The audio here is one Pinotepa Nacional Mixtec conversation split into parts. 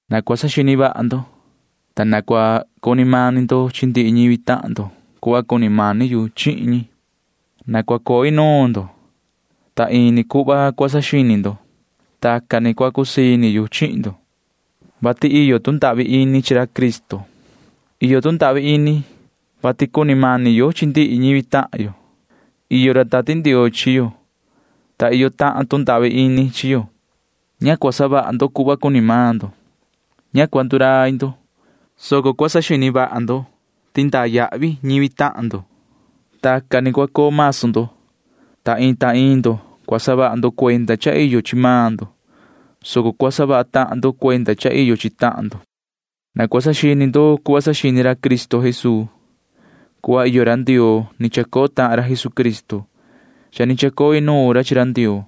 Na cua saxini vaha ndo, ta na cua cuni mani ndo chi ndihi ñivi tahan ndo cuhva cuni mani yu chihin ñi. Na cua coo inuun ndo, ta ini tuhun cua saxini ndo. Tacan ni cua cusii ini yu chihin ndo, vati iyo tu ndahvi ini chi ra Cristo. Iyo tu ndahvi ini, vati cuni mani yo chi ndihi ñivi tahan yo. Iyo ra Tati Ndioo chi yo, ta iyo tahan tu ndahvi ini chi yo. Ña cua savaha ndo cuhva cuni maan ndo. Ña cua ndurai ndo, soco cua saxini vaha ndo ti iyo ca yavi ndaa chi ñivi tahan ndo. Tacan ni cua coo masu ndo. Ta iin ta iin ndo cua saha ndo cuenda cha iyo chi maan ndo, soco cua saha vaha tahan ndo cuenda cha iyo chi tahan ndo. Na cua saxini ndo cuhva saxini ra Cristo Jesuu. Cuhva iyo ra Ndioo ni chacoo tahan ra Jesucristo. Cha ni chacoo inuun ra chi ra Ndioo,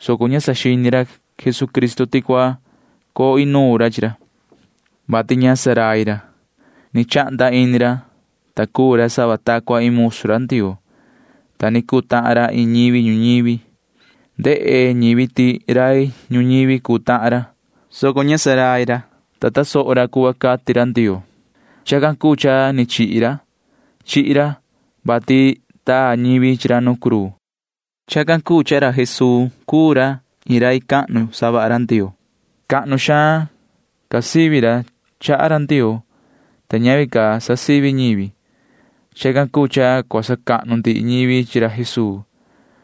soco ña saxini ra Jesucristo ti cua coo inuun ra chi ra, vati ña rai cuni ra. Ni chahnda ini ra, ta cuu ra sava ta cua iin musu ra Ndioo, ta ni cuu tahan ra iin ñivi ñuñivi. Ndehe ñivi ti rai ñuñivi cuu tahan ra, soco ña rai cuni ra, ta tasoho ra cuhva cati ra Ndioo. Chacan cuu cha ni chihi ra. Chihi ra, vati taa ñivi chi ra nu cruu. Chacan cuu cha cuu ra Jesuu iin rai cahnu savaha ra Ndioo. Cahnu xaan ca sivi maan ra chaha ra Ndioo, ta ñavi ca sa sivi ñivi. Chacan cuu cha cua sacahnu ndihi ñivi chi ra Jesuu.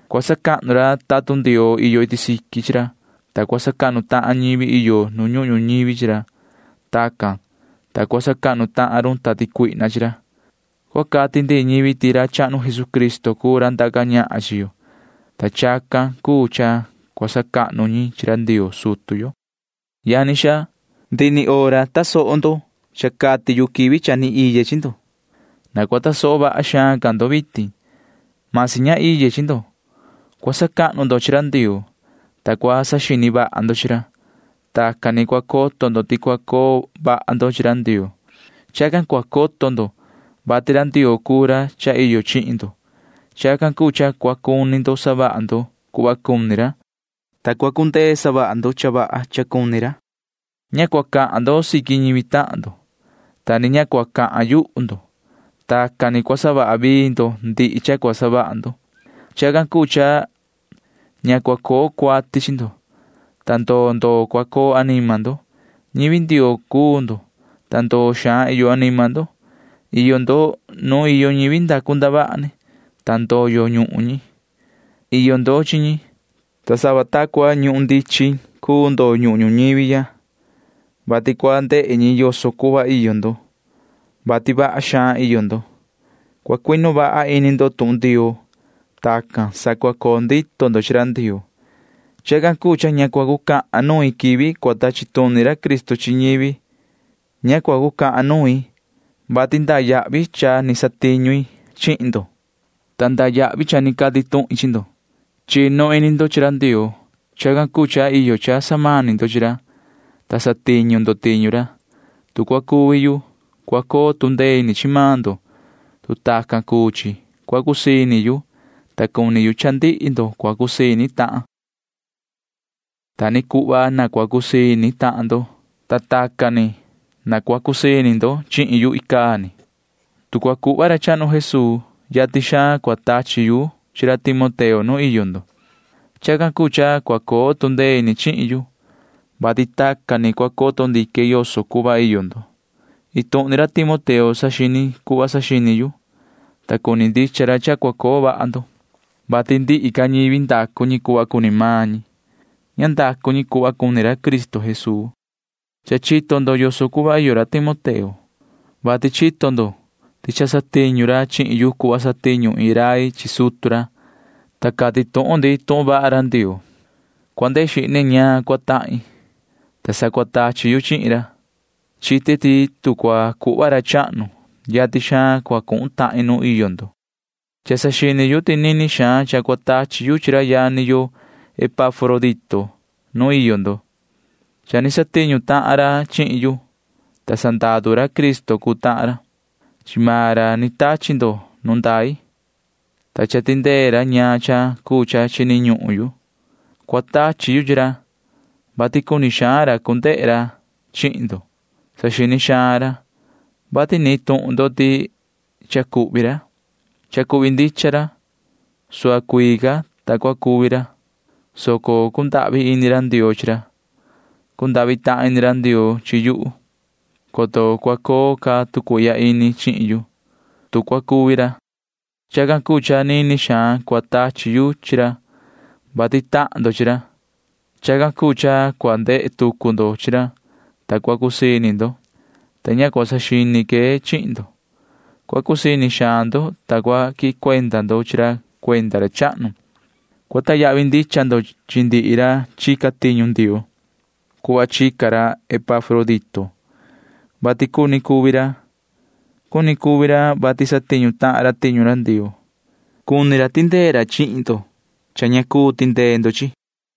Cua sacahnu ra tatun Ndioo iyo iti siqui chi ra, ta cua sacahnu tahan ñivi iyo nu ñuhun ñuñivi chi ra. Tacan, ta cua sacahnu tahan run tati cuihna chi ra. Cua cati ndihi ñivi ti ra chahnu Jesucristo cuu ra ndaca ñahan chi yo, ta chacan cuu cha cua sacahnu ñi chi ra Ndioo sutu yo. Yani xaa, ndihi hora cha ni tasoho ndo cha cati yu quivi cha ni vii iye chi ndo. Na cua tasoho vaha xaan ca ndo vitin―masi ña iye chi ndo. Cua sacahnu ndo chi ra Ndioo, ta cua saxini vaha ndo chi ra. Tacan ni cua coto ndo ti cua coo vaha ndo chi ra Ndioo. Chacan cua coto ndo, vati ra Ndioo cuu ra cha iyo chihin ndo. Chacan cuu cha cua cuni ndo savaha ndo cuhva cuni ra, ta cua cundee savaha ndo cha vaha cha cuni ra. Ña cua cahan xaan ndo chi ñivi tahan ndo, ta ni ña cua cahan yuhu ndo. Tacan ni cua savaha vii ndo ndihi cha cua savaha ndo. Chacan cuu cha ña cua coo cuati chi ndo, ta ndoo ndoo cua coo anima ndo. Ñivi Ndioo cuu ndo, ta ndoo xaan iyo anima ndo. Iyo ndo nuun iyo ñivi ndacu ndavaha ni, ta cha ndoyo ñuhun ñi. Iyo ndo chi ñi, ta sava ta cua iin ñuhun ndichin cuu ndo ñuhun ñuñivi ya, vati cua ndehe ñi yoso cuhva iyo ndo, vati iyo vaha xaan ndo. Cua cuinu vaha ini ndo tuhun Ndioo. Tacan sa cua coo ndito ndo chi ra Ndioo. Chacan cuu cha ña cua cucahan nuin quivi cua tachi tuni ra Cristo chi ñivi. Ña cua cucahan nuin, vati iyo yavi ndaa cha ni satiñu i chihin ndo, ta iyo yavi ndaa cha cati tuhin chi ndo. Chinu ini ndo chi ra Ndioo. Chacan cuu cha iyo cha samani ndo chi ra, ta satiñu ndo tiñu ra. Tu cua cuvi yu, cua coo tu ndee ini chi maan ndo. Tu tacan cuu chi, cua cusii ini yu, ta cuni yu cha ndihi ndo cua cusii ini tahan ndo. Ta ni cuhva na cua cusii ini tahan ndo, ta tacan ni cusii ini ndo chihin yu icaa ni. Tu cua cuhva ra chahnu Jesuu, yatin xaan cua tachi yu chi ra Timoteo nu iyo ndo. Chacan cuu cha cua coo tu ndee ini chihin yu, vati tacan ni cua coto ndique yoso cuhva iyo ndo. Iin tuhun maan ra Timoteo saxini cuhva saxini yu, ta cuni ndicha ra cha cua coo vaha ndo, vati ndihi ca ñivi savaha cuhva cuni maan ñi. Ña savaha ñi cuhva cuni ra Cristo Jesuu. Cha chito ndo yoso cuhva iyo ra Timoteo, vati chito ndo ti cha satiñu ra chihin yu cuhva satiñu iin rai chi sutu ra, ta cati tuhun ndi tuhun vaha ra Ndioo. Cua ndehe xihne ñaan cua tahin, ta sa cua tachi yu chihin ra. Chite ti tu cua cuhva ra chahnu, yatin xaan cua cuhun tahin nuun iyo ndo. Cha saxini yu ti nini xaan cha cua tachi yu chi ra yani yo Epafrodito nuun iyo ndo. Cha ni satiñu tahan ra chihin yu, ta sandaru ra Cristo cuu tahan ra. Chi maan ra ni tachi ndo nu ndai, ta cha tindee ra ñaan cha cuu cha chini ñuhun yu. Cua tachi yu chi ra, vati cuni xaan ra cu ndehe ra chihin ndo. Saxini xaan ra, vati nihin tuhun ndo ti cha cuhvi ra. Cha cuhvi ndicha ra. Suhva cuii ca, ta ni cuni cuvi ra, soco cundahvi ini ra Ndioo chi ra. Cundahvi tahan ini ra Ndioo chi yuhu, coto cua coo ca tu cuihya ini chihin yu, ta cua cuvi ra. Chacan cuu cha nini xaan cua tachi yu chi ra, vati tahan ndo chi ra. Chacan cuu cha cua ndehe tucu ndo chi ra, ta cua cusii ini ndo, ta ña cua saxini que chihin ndo. Cua cusii ini vaha ndo, ta cua quihin cuenda ndo chi ra cuenda ra chahnu. Cua sacahnu ndicha ndo chi ndihi ra chica tiñu Ndioo [cuhva chica ra Epafrodito], vati cuni cuvi ra. Cuni cuvi ra, vati satiñu tahan ra tiñu ra Ndioo. Chacan cuu cha sacuinu ra cha cumani cha cua tindee ndo chihin yu.